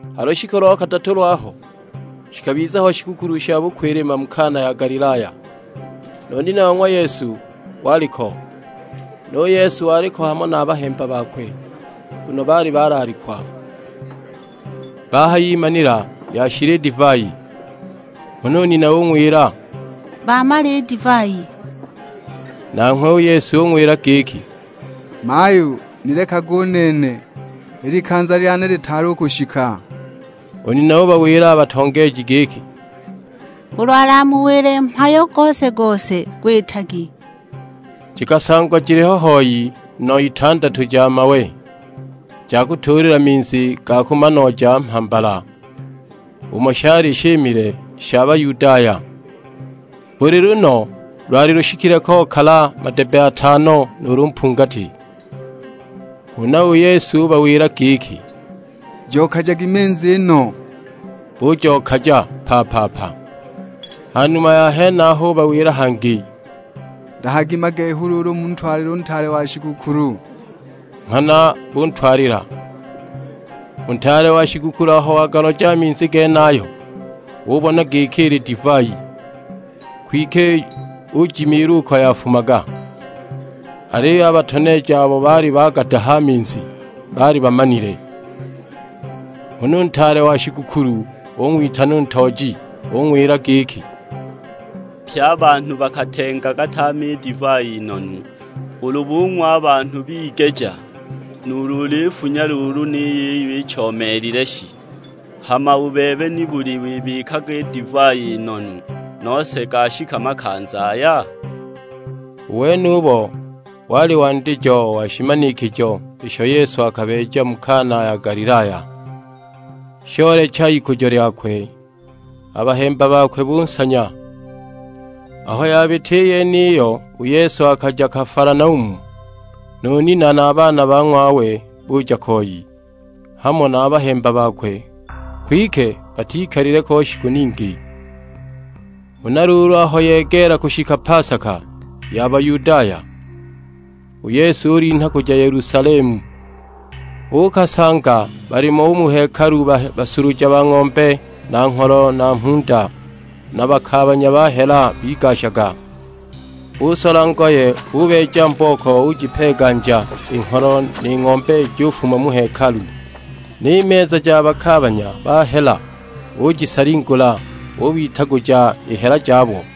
Ha lushiku lo kadatu lwaho, shikabiza ho shigukulu sha bukwilima mu Kana ya Galilaya; nu nina wa ng'wa Yesu waliko. Nu Yesu waliko hamo na a bahemba bakwe, nguno baali balaalikwa. Bahayimanila yashila i divai; huna u nina ung'wila, "Bamala i divai!" Nanghwe u Yesu ung'wila giki, "Mayu, nilekage u nene, i likanza lyane litaali u kushika!" U nina ubawila a batoneeji giki, "Ulu alamuwile mhayo gose-gose gwitagi." Jikasangwa jiliho hoi nno itandatu ja mawe, ja kutuulila minzi ga kumanooja mhambala, umo shali shimile sha Bayudaya. Buli lunno lwali lushikile kokala madebbe atano nuulu mpungati. Huna u Yesu ubawila giki, "Jokajagi minzi i nno." Bujokaja pa-pa-pa. Ha numa ya henaho ubawila hangi, "Dahagi magehu luulu muntwalile u ntaale wa shigukulu!" Nghana buntwalila. U ntaale wa shigukulu aho wagaloja a minzi genayo, ubona giki ili divai; kwike ujimiilwa uko yafumaga, aliyo a batoneeji abo baali bagadaha a minzi baali bamanile. Huna u ntaale wa shigukulu ung'witana u ntooji. Ung'wila giki, "Pye a banhu bakatengaga tame i divai i nonu; ulu bung'wa a banhu bigeja, nuulu uliyifunya luulu ni yiyo ichoomeelile shi! Hama u bebe nibuli wibikaga i divai i nonu, nose gashika makanza aya?" U wenubo wali wandijo wa shimanikijo isho Yesu akabeeja mu Kana ya Galilaya; shoolecha ikujo lyakwe, a bahemba bakwe bunsanya. Aho yabita i yeniyo u Yesu akaja Kafalanaumu; nu nina na a baana ba ng'wawe buja koi, hamo na a bahemba bakwe, kwike batikalile ko shiku ningi. Huna luulu aho yegeela kushika pasaka ya Bayudaya, u Yesu ulinha kuja Yelusalemu. Uukasanga balimo u mu hekalu basuluja ba ng'ombe na ngholo na mhunda, na bakaabanya ba hela bigashaga. Usola ngoye ubeeja mbooko, ujipeeganja i ngholo ni ng'ombe jufuma u mu hekalu; ni meza ja bakaabanya ba hela ujisalingula, ubitaguja i hela jabo.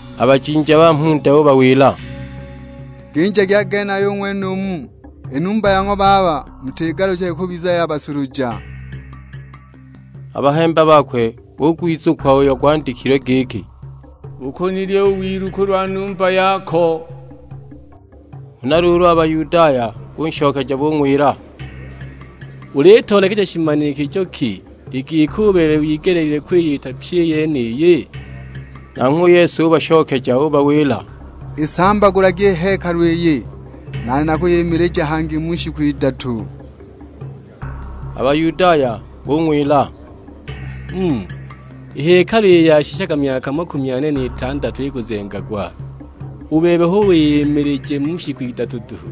A bajinja ba mhunda ubawila, "Ginjagi a genaya u ng'wenumu, i numba ya ng'wa Baba mutigaluchage kubiza ya basuluja!" A bahemba bakwe bugwizukwa uyo gwandikilwe; giki, "Bukunilya u wilu kulwa numba yako." Huna luulu a Bayudaya bunshokeja bung'wila, "Ulitoolekeja shimanikijo ki, i giki u bebe wigeleelilwe kwiyita pyi i yeniyi?" Nanghwe u Yesu ubashokeja ubawila, "Isambagulagi i hekalu iyi, nane nakwiyimilija hangi mu shiku idatu." A Bayudaya bung'wila, "Mm! I hekalu iyi yashishaga myaka makumi ane n'itandatu ikuzengagwa, u bebe hu wiyimilije mu shiku idatu duhu!"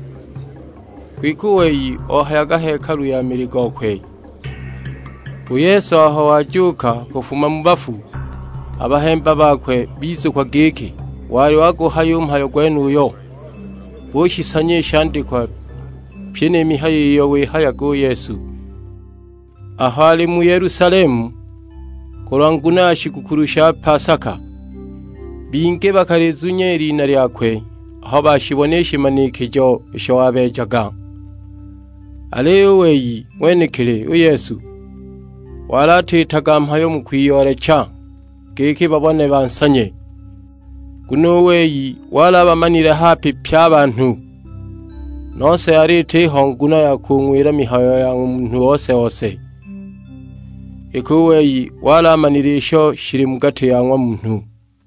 Kwike u wei ohayaga hekalu ya mili gokwe. U Yesu aho wajuuka kufuma mu bafu, a bahemba bakwe bizukwa giki wali waguhaya u mhayo gwenuyo, bushisanya i shandikwa, pyi ni mihayo iyo wihayaga u Yesu. Aho ali mu Yelusalemu kulwa nguno ya shigukulu sha pasaka, bingi bakalizunya i lina lyakwe aho bashibona i shimanikijo isho wabeejaga. Aliyo u wei ng'wenekili u Yesu, wali atiitaga mhayo mu kwiyoolecha giki babone bansanye, nguno u wei wali abamanile hape pye a banhu. Nose yali itiho nguno ya kung'wila mihayo ya ng'wa munhu ose-ose, iki u wei wali amanile isho shili mu gati ya ng'wa munhu.